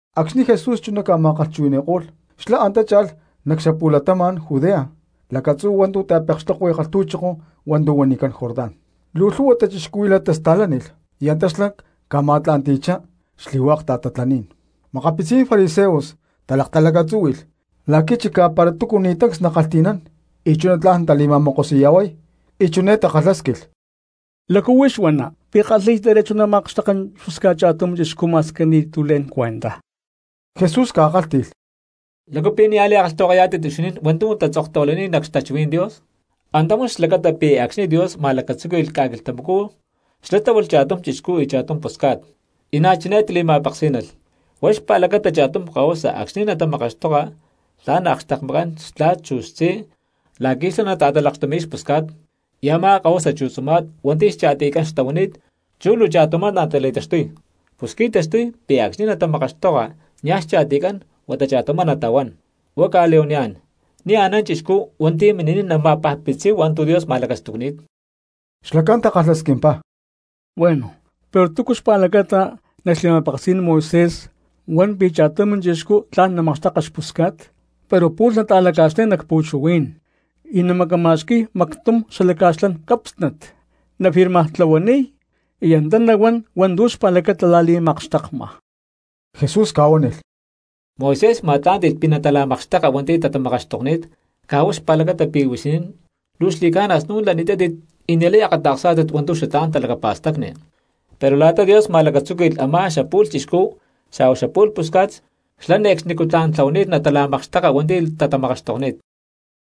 Acxni̠ Jesús chuná ca̠ma̠kalhchuhui̠ni̠ko̠lh xlá antá cha̠lh nac xapu̠latama̠n Judea lacatzú hua̠ntu̠ xta̠pekxtokui kalhtu̠choko hua̠ntu̠ huanicán Jordán. Luu lhu̠hua cristianos tasta̠lánilh y antá xlá ca̠ma̠tla̠nti̠chá xli̠hua̠k ta̠tatlaní̠n. Makapitzí̠n fariseos talaktalacatzúhui̠lh la̠qui̠ chicá para túcu ni̠ tancs nakalhti̠nán y chuná tla̠n natali̠ma̠mokosi̠ya̠huay, y chiné takalhásquilh: —¿Lácu huix huana, pi̠ kalhi̠y derecho namakxteka xpusca̠t cha̠tum chixcú ma̠squi ni̠tu̠ le̠n cuenta? Jesús ca̠kálhti̠lh: —¿Lácu pi̠ nia̠ li̠kalhtahuakayá̠tit huixinín hua̠ntu̠ tatzoktahuilani̠t nac xtachuhuí̠n Dios? Antá huan xlacata pi̠ acxni̠ Dios ma̠lacatzúqui̠lh ca̠quilhtamacú xlá tláhualh cha̠tum chixcú y cha̠tum pusca̠t. Y na̠ chiné li̠ma̠peksí̠nalh: “Huá xpa̠lacata, cha̠tum kahuasa acxni̠ natamakaxtoka tla̠n akxtekmakán xtla̠t chu xtzí la̠qui̠ xlá nata̠talakxtumi̠y xpusca̠t, y a̠má kahuasa chu tzuma̠t hua̠nti̠ xcha̠tiycán xtahuani̠t chú luu cha̠tumá natali̠taxtuy.” Pus qui̠taxtuy pi̠ acxni̠ natamakaxtoka niaj xcha̠tiycán huata cha̠tumá natahuán. Hua̠ cca̠li̠huaniyá̠n, ni̠ anán cristiano hua̠nti̠ mini̠niy nama̠pajpitziy hua̠ntu̠ Dios ma̠lacastucni̠t. Xlacán takalhasquimpá: —Bueno, pero ¿túcu chú xpa̠lacata nac xli̠ma̠peksí̠n Moisés huan pi̠ cha̠tum chixcú tla̠n namakxteka xpusca̠t pero pu̠lh nata̠laca̠xlay nac pu̠chuhuí̠n y namacama̠xqui̠y mactum xatalaca̠xlán cápsnat, nafirmartlahuaniy y antá nahuán hua̠ntu̠ xpa̠lacata la̠li̠makxtekma? Jesús ca̠huánilh: —Moisés ma̠tlá̠nti̠lh pi̠ natala̠makxteka hua̠nti̠ tatamakaxtokni̠t caj huá xpa̠lacata pi̠ huixinín luu xli̠ca̠na snu̠n lani̠tátit y ni̠lay akata̠ksá̠tit hua̠ntu̠ xatlá̠n talacapa̠stacni; pero la̠ta Dios ma̠lacatzúqui̠lh a̠má xapu̠lh chixcú xa̠huá xapu̠lh pusca̠t xlá ne̠cxnicú tla̠n tlahuani̠t natala̠makxteka hua̠nti̠ tatamakaxtokni̠t.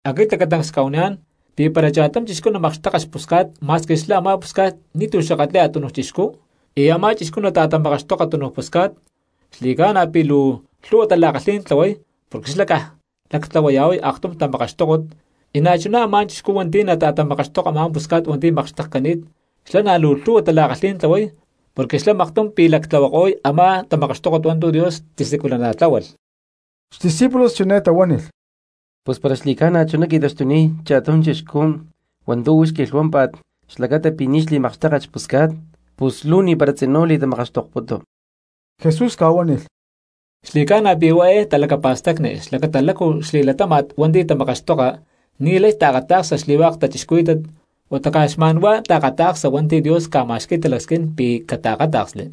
Aquit lacatancs cca̠huaniyá̠n pi̠ para cha̠tum chixcú namakxteka xpusca̠t ma̠squi xlá a̠má pusca̠t ni̠tu̠ xakatli̠y a̠tunuj chixcú, y a̠má chixcú nata̠tamakaxtoka túnuj pusca̠t, xli̠ca̠na pi̠ luu lhu̠hua tala̠kalhí̠n tlahuay porque xlá caj lactlahuaya̠huay aktum tamakaxtókot, y na̠chuná a̠má chixcú hua̠nti̠ nata̠tamakaxtoka a̠má pusca̠t hua̠nti̠ makxtekcani̠t xlá na̠ luu lhu̠hua tala̠kalhí̠n tlahuay porque xlá maktum pi̠ lactlahuako̠y a̠má tamakaxtókot hua̠ntu̠ Dios tisiculana̠tláhualh. Xdiscípulos chiné tahuánilh: —Pus para xli̠ca̠na chuná qui̠taxtuniy cha̠tum chixcú hua̠ntu̠ huix quilhuámpa̠t xlacata pi̠ ni̠ xli̠makxtéket xpusca̠t, pus luu ni̠para tzinú li̠tamakaxtokputu. Jesús ca̠huánilh: —Xli̠ca̠na pi̠ huá eé talacapa̠stacni xlacata lácu xli̠latama̠tcán hua̠nti̠ tamakaxtoka ni̠lay taakata̠ksa xli̠hua̠k cristianos huata caj xma̠n huá taakata̠ksa hua̠nti̠ Dios ca̠ma̠xqui̠y talacasquín pi̠ cataakáta̠ksli.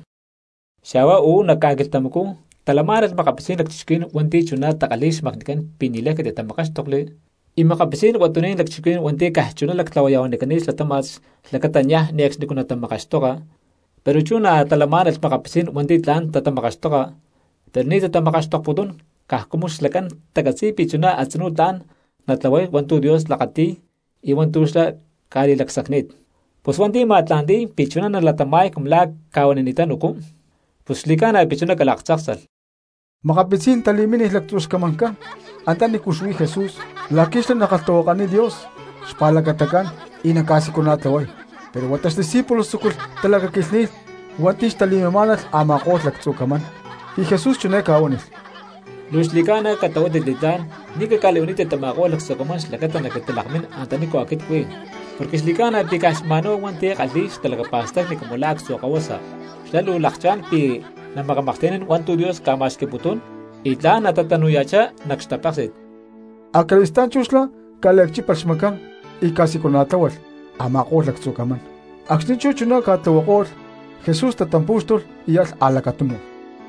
Xa̠huá uú nac ca̠quilhtamacú talamá̠nalh makapitzí̠n lacchixcuhuí̠n hua̠nti̠ chuná takalhi̠y xmacnicán pi̠ ni̠lay catitatamakáxtokli, y makapitzí̠n huatuní̠n lacchixcuhuí̠n hua̠nti̠ caj chuná lactlahuaya̠huanicani̠t xlatama̠tcán xlacata niaj ne̠cxnicú natatamakaxtoka, pero chú na̠ talamá̠nalh makapitzí̠n hua̠nti̠ tla̠n tatamakaxtoka pero ni̠ tatamakaxtokputún caj cumu xlacán tacatzi̠y pi̠ chuná a̠tzinú tla̠n natatlahuay hua̠ntu̠ Dios lakati̠y y hua̠ntu̠ xlá ca̠li̠lacsacni̠t. Pus hua̠nti̠ ma̠tla̠nti̠y pi̠ chuná nalatama̠y cumu la̠ cca̠huanini̠tán ucú, pus xli̠ca̠na pi̠ chuná calaktzáksalh. Makapitzí̠n cristianos tali̠mínilh lactzu xcamancán anta nícu xuí Jesús la̠qui̠ xlá nakalhtahuakaniy Dios xpa̠lacatacán y naca̠siculana̠tlahuay. Pero huata xdiscípulos tzúculh talacaquilhni̠y hua̠nti̠ xtali̠mimá̠nalh a̠ma̠ko̠lh lactzu camán. Y Jesús chiné ca̠huánilh: —Luu xli̠ca̠na catlahuátit li̠tlá̠n ni̠ caca̠li̠huanítit tama̠ko̠lh lactzu camán xlacata naquintalakmín antanícu aquit cuí, porque xli̠ca̠na pi̠ caj xma̠nhuá hua̠nti̠ kalhi̠y xtalacapa̠stacni cumu la̠ actzu kahuasa xlá luu lakchá̠n pi̠ namakamaklhti̠nán hua̠ntu̠ Dios ca̠ma̠xqui̠putuná̠n y tla̠n natatanu̠ya̠chá nac xtapéksi̠t. Acali̠stá̠n chú xlá ca̠liacchípalh xmacán y ca̠siculana̠tláhualh a̠ma̠ko̠lh lactzu camán. Acxni̠ chú chuná ca̠tlahuako̠lh Jesús tatampú̠xtulh y alh a̠lacatunu.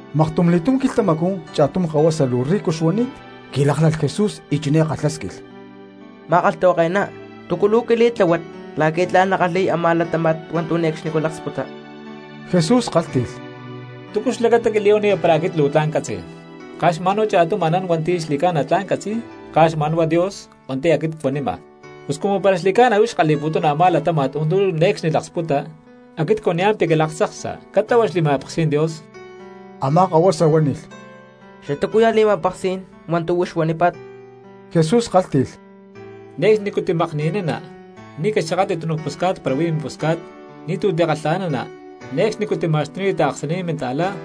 Maktum quilhtamacú cha̠tum kahuasa luu rico xuani̠t qui̠láklalh Jesús y chiné kalhásquilh: —Ma̠kalhtahuake̠ná, ¿túcu luu quili̠tláhuat la̠qui̠ tla̠n nackalhi̠y a̠má latáma̠t hua̠ntu̠ ne̠cxnicú laksputa? Jesús kálhti̠lh: —¿Túcu xlacata quili̠huaniya para aquit luu tla̠n ccatzi̠y? Caj xma̠n cha̠tum anán hua̠nti̠ xli̠ca̠na tla̠n catzi̠y, caj xma̠n huá Dios hua̠nti̠ aquit cuanima. Pus cumu para xli̠ca̠na huix kalhi̠putuna a̠má latáma̠t hua̠ntu̠ ne̠cxni laksputa, aquit cuaniyá̠n pi̠ calaktzaksa catlahua xli̠ma̠peksí̠n Dios. Amá kahuasa huánilh: —¿Xatúcuya̠ li̠ma̠peksí̠n hua̠ntu̠ huix huanípa̠t? Jesús kálhti̠lh: —Ne̠cxnicú timakni̠nana, ni̠ caxakatli tunuj pusca̠t para huí mimpusca̠t, ni̠tu̠ tikalha̠nana, ne̠cxnicú tima̠xtuniya taaksaní̠n minta̠cristiano,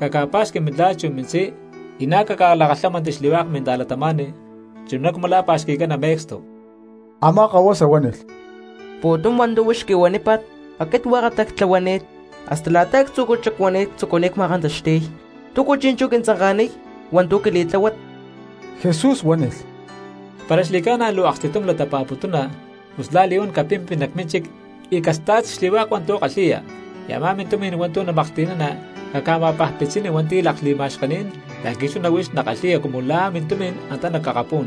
caca̠pa̠xqui mintla̠t chu mintzí, y na̠ caca̠lakalhámanti xli̠hua̠k minta̠cristianos chuná cumu la̠ pa̠xqui̠cana me̠cstu. Amá kahuasa huánilh: —Pu̠tum hua̠ntu̠ huix quihuanípa̠t aquit hua̠katá ctlahuani̠t hasta la̠ta actzu̠cú xacuani̠t ctzucuni̠t ma̠kantaxti̠y. ¿Túcu chi̠nchú quintzanka̠niy hua̠ntu̠ quili̠tláhuat? Jesús huánilh: —Para xli̠ca̠na luu aksti̠tum latapa̠putuna, pus la̠li̠huán capimpi nac mínchic y casta̠t xli̠hua̠k hua̠ntu̠ kalhi̠ya, y a̠má mintumi̠n hua̠ntu̠ namaklhti̠nana caca̠ma̠akpitzini hua̠nti̠ lakli̠ma̠xkení̠n la̠qui̠ chuná huix nakalhi̠ya cumu la̠ mintumi̠n antá nac akapú̠n.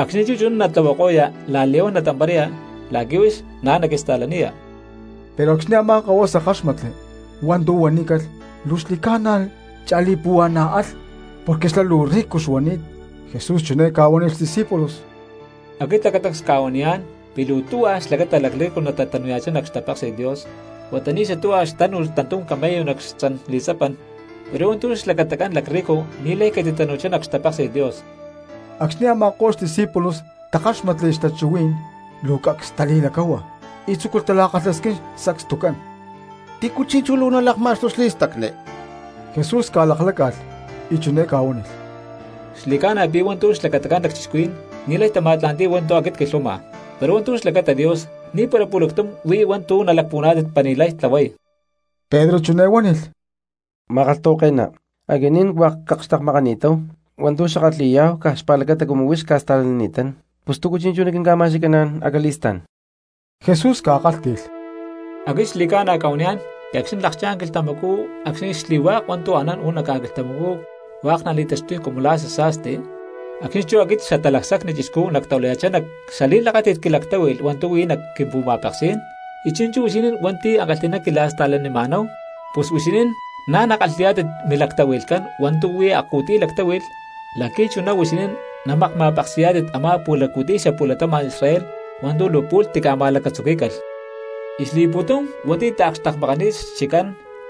Acxni̠ chú chuná natlahuako̠ya la̠li̠huán natamparaya la̠qui̠ huix na̠ naquista̠laniya. Pero acxni̠ a̠má kahuasa káxmatli hua̠ntu̠ huanícalh luu xli̠ca̠na cha̠li̠puhua̠na̠ alh porque xlá luu rico xuani̠t. Jesús chiné ca̠huánilh xdiscípulos: —Aquit lacatancs cca̠huaniyá̠n pi̠ luu tuhua xlacata lacrrico natatanu̠ya̠chá nac xtapéksi̠t Dios. Huata ni̠ xatuhua xtánu̠lh tantum camello nac xtzan li̠tzapan, pero hua̠ntu̠ xlacatacán lacrrico ni̠lay catitatanu̠chá nac xtapéksi̠t Dios. Acxni̠ a̠ma̠ko̠lh xdiscípulos takáxmatli xtachuhuí̠n luu cacs tali̠lacáhua y tzúculh tala̠kalhasquín sacstucán: —¿Tícu chi̠nchú luu nalakma̠xtuy xli̠stacni? Jesús ca̠lakláca̠lh y chiné ca̠huánilh: —Xli̠ca̠na pi̠ hua̠ntu̠ xlacatacán lacchixcuhuí̠n ni̠lay tama̠tla̠nti̠y hua̠ntu̠ aquit cquilhuama, pero hua̠ntu̠ xlacata Dios ni̠para pu̠lactum huí hua̠ntu̠ nalacpuhuaná̠tit para ni̠lay tlahuay. Pedro chiné huánilh: —Ma̠kalhtahuake̠ná, aquinín hua̠k cakxtekmakani̠táhu hua̠ntu̠ xackalhi̠yá̠hu caj xpa̠lacata cumu huix cca̠sta̠lanini̠tán, pus ¿túcu chi̠nchú naquinca̠ma̠xqui̠caná̠n acali̠stá̠n? Jesús ca̠kálhti̠lh: —Aquit xli̠ca̠na cca̠huaniyá̠n pi̠ acxni̠ nalakchá̠n quilhtamacú acxni̠ xli̠hua̠k hua̠ntu̠ anán uú nac ca̠quilhtamacú hua̠k nali̠taxtuy cumu la̠ xasa̠sti, acxni̠ chú aquit Xatalacsacni Chixcú nactahuilaya̠chá nac xali̠lakáti̠t quilactáhui̠lh hua̠ntu̠ huí nac quimpu̠ma̠peksí̠n, y chi̠nchú huixinín hua̠nti̠ ankalhi̠ná quila̠sta̠lanima̠náhu pus huixinín na̠ nakalhi̠yá̠tit milactahui̠lhcán hua̠ntu̠ huí akcu̠tiy lactáhui̠lh la̠qui̠ chuná huixinín namakma̠peksi̠yá̠tit a̠má pu̠laccu̠tiy xapu̠latama̠n Israel hua̠ntu̠ luu pu̠lh tica̠ma̠lacatzuquí̠calh. Y xli̠pu̠tum hua̠nti̠ taakxtekmakani̠t xchiccán,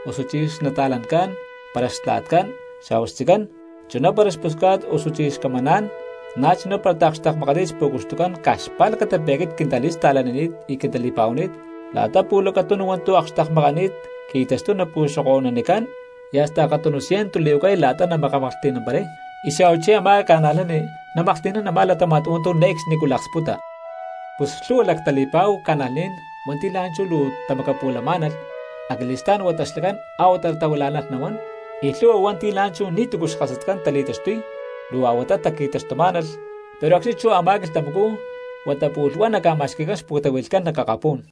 osuchí xnata̠lancán, para xtla̠tcán xa̠huá xtzicán, chuná para xpusca̠t osuchí xcamaná̠n, na̠chuná para taakxtekmakani̠t xpu̠cuxtucán caj xpa̠lacata pi̠ aquit quintasta̠lanini̠t y quintali̠pa̠huani̠t, la̠ta pu̠lacatunu hua̠ntu̠ akxtekmakani̠t qui̠taxtuy napu̠xokonicán y hasta akatunu ciento li̠huacay la̠ta namaklhti̠namparay, y xa̠huachí a̠má cristianos namaklhti̠nán a̠má latáma̠t hua̠ntu̠ ne̠cxnicú laksputa. Pus lhu̠hua lactali̠pa̠hu cristianos hua̠nti̠ la̠nchú luu tamacapu̠lamá̠nalh, acali̠stá̠n huata xlacán a̠huatá tahuilá̠nalh nahuán; y lhu̠hua hua̠nti̠ la̠nchú ni̠tu̠cu xkasatcán tali̠taxtuy luu a̠huatá taqui̠taxtumá̠nalh, pero acxni̠ chú a̠má quilhtamacú huata pu̠lh huá naca̠ma̠xqui̠cán xpu̠tahui̠lhcán nac akapú̠n.